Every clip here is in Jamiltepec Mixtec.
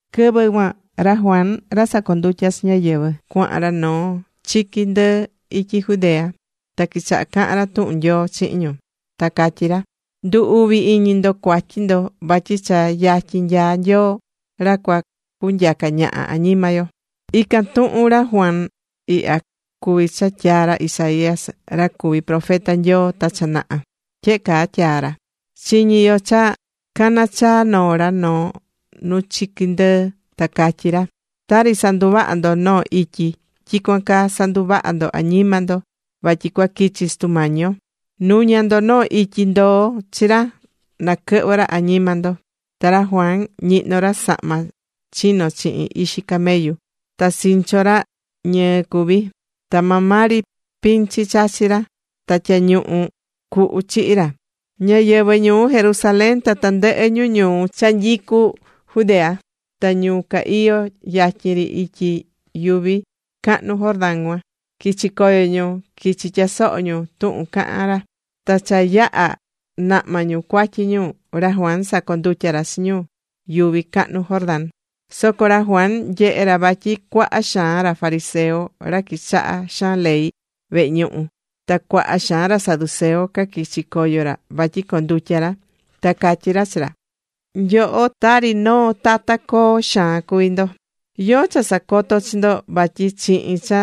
Quɨvɨ cuan ra Juan ra sacondutyá chi ñáyɨvɨ cuahan ra noo chiqui ndɨɨ ityi Judea. Ta quichaha̱ cahan ra tuhun Nyoo chihin ñu. Ta catyí ra: ―Ndu̱ uvi iñi ndo cuatyi ndo vatyi cha yatyin nyaá Nyoo ra cua cunyaca ñaha añima yo. Ican tuhun ra Juan ihya cuví cha tyaa̱ ra Isaías ra cuvi̱ profeta Nyoo ta cha naha. Tyehe caa tyaa̱ ra: Chiñí yo cha caná chaa noo ra noo nu chiqui ndɨɨ ta catyí ra: “Tari sanduvahá ndo noo ityi, tyicuan caa sa̱nduvaha ndo añima ndo, vatyi cua quichi Sutu Mañi yo. Nu̱ña ndo noo ityi ndoo chi ra naquɨhvɨ ra añima ndo.” Ta ra Juan ñihnó ra sahma chino̱ chihin ixi camellu. Ta sincho ra, ñɨɨ cuví. Ta maa maa ri pinchi chachí ra ta tyañuñu cuhu chihí ra. Ñáyɨvɨ ñuu Jerusalén ta tandɨhɨ ñu ñuu cha nyicú Judea, ta ñu ca iyó yatyin ri ityi yuvi cahnu Jordán cuan, quichi coyo ñu, quichi̱ tyasoho ñu tuhun cahán ra. Ta cha yaha̱ nahma ñu cuatyi ñu, ra Juan sacondutya̱ ra chi ñu yuvi cahnu Jordán cuan. Soco ra Juan nyehe̱ ra vatyi cuaha xaan ra fariseo, ra quichahá xaan ley vehe ñuhu, ta cuaha xaan ra saduceo, caquichi̱ coyo ra vatyi condutya ra. Ta catyí ra chi ra: ―¡Nyoho, tari noo tata coo xaan cuví ndo! ¿Yóó cha sacoto̱ chi ndo vatyi chihin cha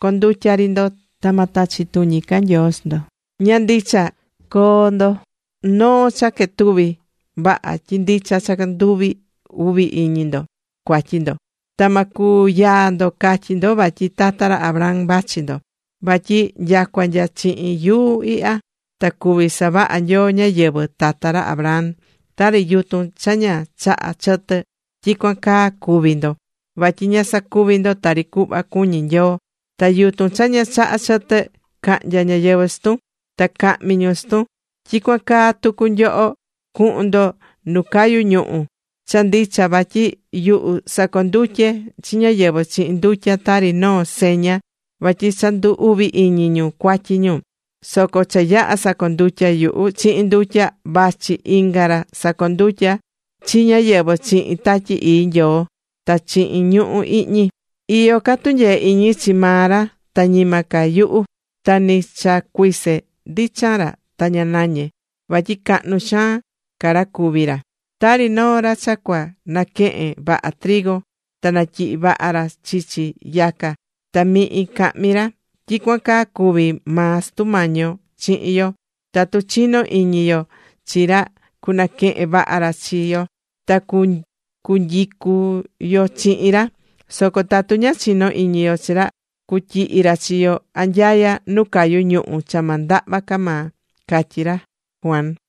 condutya ri ndo ta ma tachi tuñi ca Nyoo chi ndo? Ña ndicha. Co̱o ndo noo cha quetuví vaha tyi ndicha cha ndu uvi iñi ndo cuatyi ndo. Ta ma cuyaa ndo catyí ndo vatyi tata ra Abraham vachi ndo. Vatyi nyacua nya chihin yuu ihya ta cuví savaha Nyoo ñáyɨvɨ tata ra Abraham. Tari yutun cha ña chahá chɨtɨ, tyicuan caa cuví ndo. Vatyi ña sacuví ndo tari cuhva cuñí Nyoo. Ta yutun cha ña chahá chɨtɨ, cahnya ñáyɨvɨ chi tun. Ta cahmi ñu chi tun. Tyicuan caa tucu nyoho, cuhun ndo nu cayú ñuhu. Cha ndicha vatyi yuhu sacondutyé chi ñáyɨvɨ chihin ndutya, tari noo seña vatyi cha ndu̱ uvi iñi ñu cuatyi ñu. Soco cha yaha sacondutya yuhu chihin ndutya, vachi inga ra cusacondutya chi ñáyɨvɨ chihin Tatyi Ii Nyoo ta chihin ñuhu̱ ihñi. Iyó ca tunyee iñi chi maa ra ta ñima ca yuhu. Ta ni cha cuise ndichan ra ta ña nañe, vatyi cahnu xaan ca ra cuví ra. Tari noo ra cha cua naquehen vaha trigo ta natyihi vaha ra chichi yaca ta mihin cahmi ra, tyicuan caa cuví maa Sutu Mañi yo chihin yo. Tatu chinó iñi yo chi ra cunaquehen vaha ra chi yo. Ta cunyicu yo chihin ra. Soco tatu ña chinó iñi yo chi ra cutyihi ra chi yo anyaya nu cayu ñuhu̱ cha ma ndahva ca maa ―catyí ra Juan.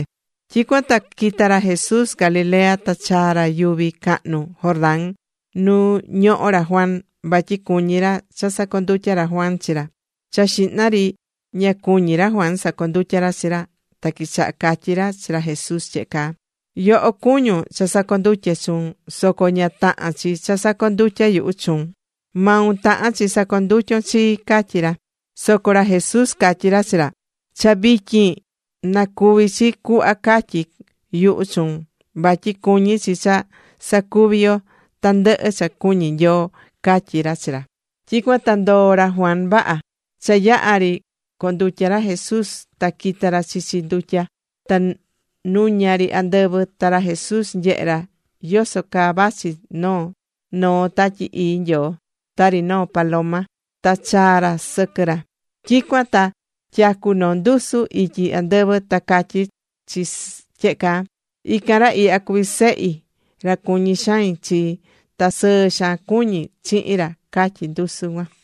Tyicuan ta quita̱ ra Jesús Galilea ta chaa̱ ra yuvi cahnu Jordán nu ñohó ra Juan, vatyi cuñí ra cha sacondutya ra Juan chi ra. Cha xihna ri ña cuñi̱ ra Juan sacondutya ra chi ra, ta quichaha̱ catyi ra chi ra Jesús tyehe caa: ―Yoho cuñún cha sacondutye chuun, soco ña tahán chi cha sacondutya yuhu chuun. Maun tahán chi sacondutyon chii ―catyí ra. Soco ra Jesús catyí ra chi ra: ―Cha vityin, na cuvi chi cuhva catyi̱ yuhu chuun. Vatyi cuñí chi cha sacuvi yo tandɨhɨ cha cuñí Nyoo ―catyí ra chi ra Juan. Tyicuan ta ndoo̱ ra Juan vaha. Cha yaha̱ ri condutya̱ ra Jesús ta quita̱ ra chichi ndutya. Ta nuña ri andɨvɨ, ta ra Jesús nyehe̱ ra yoso caa vachi noó Tatyi Ii Nyoo, tari noo paloma, ta chaa̱ chi sɨquɨ ra. Tyicuan ta tyacu noo ndusu ityi andɨvɨ, ta catyí chi tyehe caa: ―Ican ra ihya cuví Sehi, ra cuñí xain chi. Ta sɨɨ xaan cuñí chihin ra ―catyí ndusu cuan.